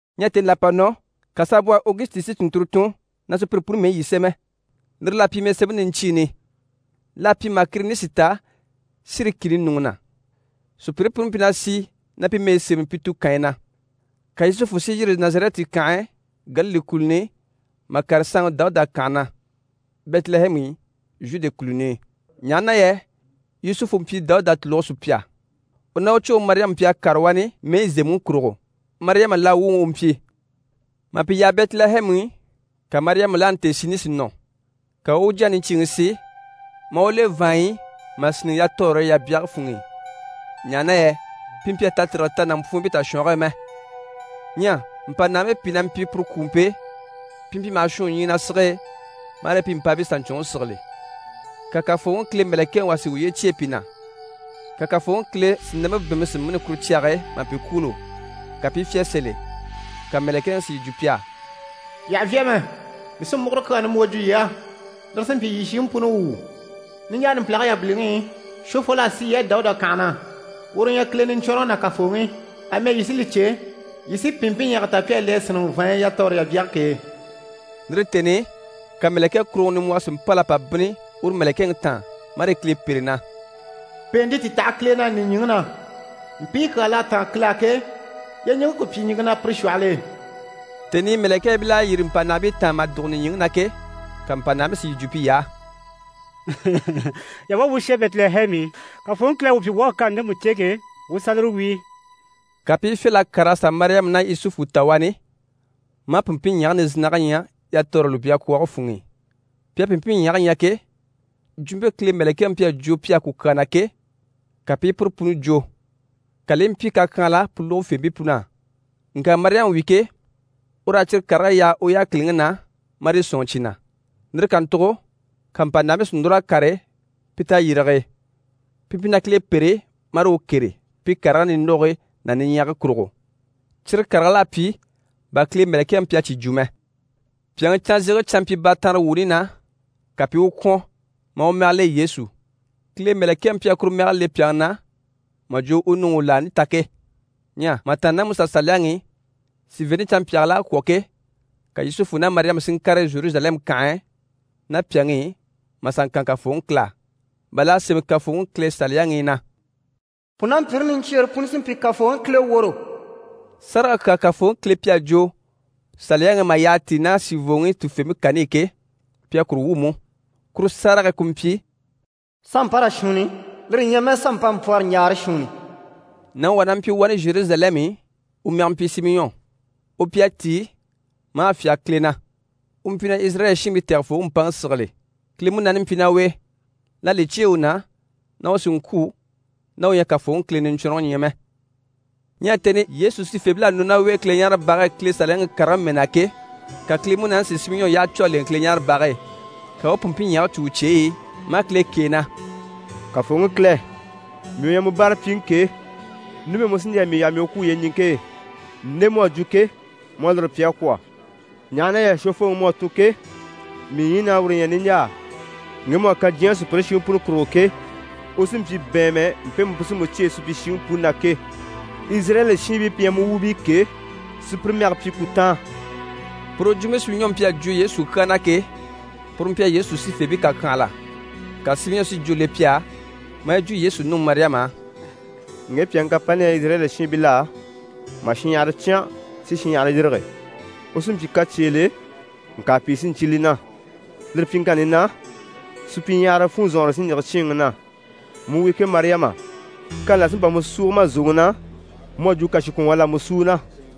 Ɲyɛ tèni là à pa nɔ, ka saanbwɔhe Ogusiti si tùnnturo tun na sùpyire puni mɛyi yi sémɛ. Lire l'à pyi mɛsemɛni niɲcyiini, l'à pyi mà Kirinisi ta Siri kìni ɲùŋɔ na. Sùpyire puni mpyi na sì na pi mɛyi sémɛni pi tukanyi na. Ka Yusufu si yîri Nazarɛti kànhe e Galile kùluni i mà kàre saanŋi Dawuda kànhe na, Bɛtilɛhɛmu i, Zhude kùluni i, ɲaha na yɛ Yusufu mpyi Dawuda tùluge sùpya. U ná u tàcwoŋi Mariyama mpyi a kàre wani mɛyi zèmɛŋi kurugo. Mariyama laa wuŋi u mpyi. Mà pi yaha Bɛtilɛhɛmu i, ka Mariyama laani tèesini si nɔ. Ka u u u jyaŋi niɲcyiiŋi si, maa u le vàanɲyi i mà sínniŋɛ yatɔɔre yabyage funŋ'i, ɲaha na yɛ pi mpyi a tatirige ta nàmpwuunbii tashwɔnge e mɛ. Ɲyɛ mpànahabii pìi na mpyi puru kwùumpe e. Pi mpyi maha shwùun ɲyii na sige e, marii pi mpàabii saɲcwɔnŋi sigili. Ka Kafooŋi Kile mɛ̀lɛkɛŋi wà si uye cyêe pi na, ka Kafooŋi Kile sìnampe bɛ̀ɛnmpe si mîni kuru cyage e mà pi kwûulo, ka pi i fyá sèe sèl'e. Ka mɛ̀lɛkɛŋi si yi jwo pi á: «Yii àha vyá mɛ, mii sí múguro kyaa nimbwoo jwo yii á, lire sí n‑pyi yii shiŋi puni wuu. Niɲjaa numpilage yabiliŋi i, Shwofol'à si yii á Dawuda kànhe na. Uru u ɲyɛ Kile Niɲcwɔnrɔŋi ná Kafooŋi. Amɛ yii sí li cè, yii sí pìnmpinɲyɛga ta pi à le a sínniŋɛ vàanɲyi i yatɔɔre yabyage k'e.» Lire tèni i, ka mɛ̀lɛkɛkuruŋɔ nimbwɔhɔ si mpâl'a pa bínni uru mɛ̀lɛkɛŋi taan, marii Kile pêre na: «Pèente ti taha Kile na nìɲyiŋi na. Mpii kyaa l'à táan Kile á ke, yyeɲiŋke ku pyi ɲìŋke na pire shwɔhɔl'e.» Tèni i mɛ̀lɛkɛɛbil'à yîri mpànahabii taan mà dùgo nìɲyiŋi na ke, ka mpànahabii si yi jwo piy'á: «Yii a wá, wuu u shà Bɛtilɛhɛmu i, Kafooŋi Kile à wuu pyi wuu à kani ndemu cè ke, wuu u sà lire wíi.» Ka pi i fyâl'a kàr'a sà Mariyama ná Yusufu ta wani, maa pìnmpinɲyɛge nizinnage ɲya yatɔɔre lùbyakwɔɔge funŋ'i. Pi à pìnmpinɲyɛge ɲya ke, jwumpe Kile mɛ̀lɛkɛŋi mpyi a jwo pi á ku kyaa na ke, ka pi i puru puni jwo, ka li i mpyi kakyanhala pu lógofeebii pun'á. Ŋka Mariyama wi ke, ur'à cyire karigii yaha u yákiliŋi na, marii sɔ̂nŋi cyi na. Lire kàntugo ka mpànahabii si núr'a kàre pi tayirige e, pi mpyi na Kile pêre marii u kêre pi karigii nindogogii ná niɲyagii kurugo. Cyire karigil'à pyi bà Kile mɛ̀lɛkɛŋi mpyi a cyi jwo mɛ. Pyàŋi canzege canmpyibaatanrewuuni na, ka pi i u kwɔ̀n, maa u mɛge le Yesu. Kile mɛ̀lɛkɛŋi mpyi a kuru mɛge le pyàŋi na mà jwo u nuŋi u u laani ta ke. Ɲyɛ mà tàanna ná MusaSaliyaŋi i, sìiveente canmpyaagil'à kwɔ̀ ke, ka Yusufu ná Mariyama si ŋkàre Zheruzalɛmu kànhe e ná pyàŋi i mà sà ŋkan Kafooŋi Kile á, bà l'à sémɛ Kafooŋi Kile Saliyaŋi i na: «Pùnampyire niɲcyiire puni sí n‑pyi Kafooŋi Kile woro.» Sárage kyaa Kafooŋi Kile mpyi a jwo Saliyaŋi i mà yyaha tíi ná sìivooŋi tufeempe kani i ke, pi à kuru wwû mú. Kuru sárage ku mpyi: «Sanmpanra shuunni, lire ɲyɛ mɛ sanmpanmpwɔrɔɲjaara shuunni.» Nàŋi wà na mpyi wani Zheruzalɛmu i, u mɛge mpyi Simiyɔn. U mpyi a tíi maa fyáge Kile na. U mpyi na Izirayɛli shiinbii Tɛgɛfooŋi mpaŋi sigili. Kile Munaani mpyi ná u e. L'à li cyêe u na na u sì n‑kwû ná u ɲyɛ a Kafooŋi Kile Niɲcwɔnrɔŋi ɲya mɛ. Ɲyɛ tèni i Yesu sifeebil'à sà nɔ ná u e Kileɲaarebage e Kile Saliyaŋi karigii mɛɛ na ke, ka Kile Munaani si Simiyɔn yyaha cû a lèŋɛ Kileɲaarebage e. Ka u u pìnmpinɲyɛge cû u cyeyi i, maa Kile kêe na: «Kafooŋi Kile, mii u ɲyɛ mu báarapyiŋi ke, numɛ mu sí n‑jà mii yaha mii u kwû yyeɲiŋke e, nde mu à jwo ke, mu à lire pyi a kwɔ̀, ɲaha na yɛ Shwofooŋi mu à tun ke, mii ɲyiin'à uru ɲya niɲjaa. Ŋge mu à kan diɲyɛŋi sùpyire shiŋi puni kurugo ke, u sí n‑pyi bɛ̀ɛnmɛ mpemu pu sí mu cyêe supyishiŋi puni na ke, Izirayɛli shiinbii pi ɲyɛ mu wuubii ke, si pire mɛge pyi ku táan.» Puru jwumpe Simiyɔn mpyi a jwo Yesu kyaa na ke, puru mpyi a Yesu sifeebii kàkyanhala. Ka Simiyɔn si jwó le pi á, maa yi jwo Yesu nuŋi Mariyama á: «Ŋge pyàŋi kapani li ɲyɛ Izirayɛli shiinbil'á, mà shinɲyahara cyán si shinɲyahara yîrige. U sí n‑pyi kacyeele, ŋka pìi sí n‑cyé li na. Lire pyiŋkanni na, supyiɲyahara funzɔnŋɔre sí n‑yige cyíinŋi na. Mu wi ke Mariyama, kani là sí n‑pa mu súugo ma zòŋi na, mu à jwo kàshikwɔnŋwɔɔ l'à mu sú u na.»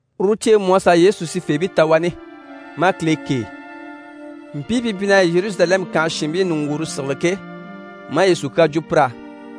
Uru ciɲjyeŋi mú à sà Yesu sifeebii ta wani, maa Kile kêe, mpii pi mpyi na Zheruzalɛmu kànhe shiinbii ɲùŋgwuure sigili ke, maa Yesu kyaa jwo pir'á.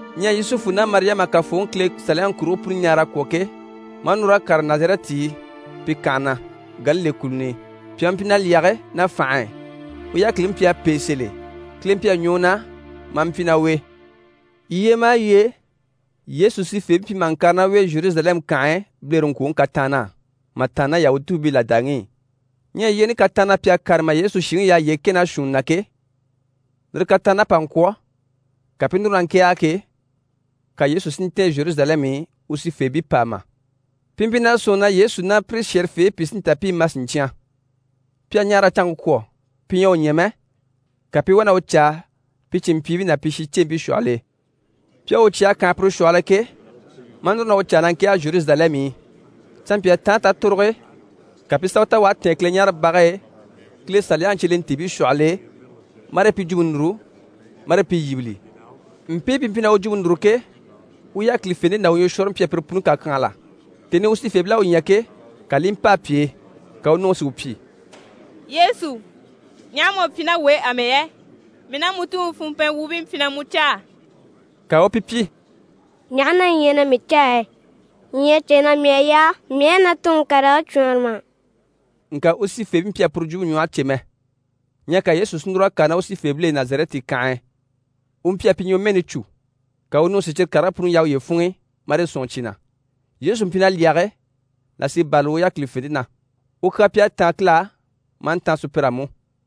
Ɲyɛ Yusufu ná Mariyama à Kafooŋi Kile Saliyaŋi kurigii puni ɲaara a kwɔ̀ ke, maa núr'a kàre Nazarɛti i, pi kànhe na, Galile kùluni i. Pyàŋi mpyi na lyɛge ná fànhe e, u yákiliŋi mpyi a pêe sèl'e. Kile mpyi a ɲwɔ u na maa mpyi ná u e. Yyee maha yyee, Yesu sifeebii mpyi maha ŋkàre ná u e Zheruzalɛmu kànhe e bilereŋkwoŋi kataann'á mà tàanna ná Yahutuubii làdaŋi i. Ɲyɛ yyeeni kataann'á pi à kàre mà Yesu shìŋi yaha yyee kɛ ná shuunni na ke, lire kataann'à pa ŋkwɔ̀, ka pi i núru na ŋkɛ̀ɛge ke, ka Yesu si ntɛ̀ɛn Zheruzalɛmu i u sifeebii pàama. Pi mpyi na sɔ̂nŋi na Yesu ná pire shɛ̀rɛfeebii pi sí n‑ta pi i ma siɲcyan. Pi à ɲaara a canŋke kwɔ̀, pi ɲyɛ a u ɲya mɛ, ka pi i wá na u caa pi cìnmpyiibii ná pi shincempii shwɔhɔl'e. Pi à u cya a kànha pire shwɔhɔl'e ke, maa núru na u caa na ŋkɛ̀ɛge Zheruzalɛmu i. Canmpyaa taanre tatoroge e, ka pi i sà u ta u à tɛ̀ɛn Kileɲaarebage e Kile Saliyaŋi cyelentiibii shwɔhɔl'e, marii pi jwumpe núru, marii pi yíbili. Mpii pi mpyi na u jwumpe núru ke, u yákilifente ná u ɲwɔshwɔɔre mpyi a pire puni kàkyanhala. Tèni i u sifeebil'à u ɲya ke, ka li i mpâa pi e, ka u nuŋi si u pyi: «Yesu, ɲaha mu à pyi ná wuu e amɛ yɛ? Mii ná mu tuŋi funmpɛn wuubii mpyi na mu caa.» Ka u u pi pyi: «Ɲaha na yii ɲyɛ na mii caa yɛ? Yii ɲyɛ a cè na mii à yaa mii u a na Tuŋi karigii cwɔɔnre mà?» Ŋka u sifeebii mpyi a puru jwumpe ɲwɔhe cè mɛ. Ɲyɛ ka Yesu si núr'a kàre ná u sifeebil'e Nazarɛti kànhe e. U mpyi a pi ɲwɔmɛɛni cû. Ka u nuŋi si cyire karigii puni yaha uye funŋ'i, marii sɔ̂nŋi cyi na. Yesu mpyi na lyɛge, là sí i bârali u yákilifente na. U kyaa mpyi a táan Kile á, maa ntáan sùpyir'á mú.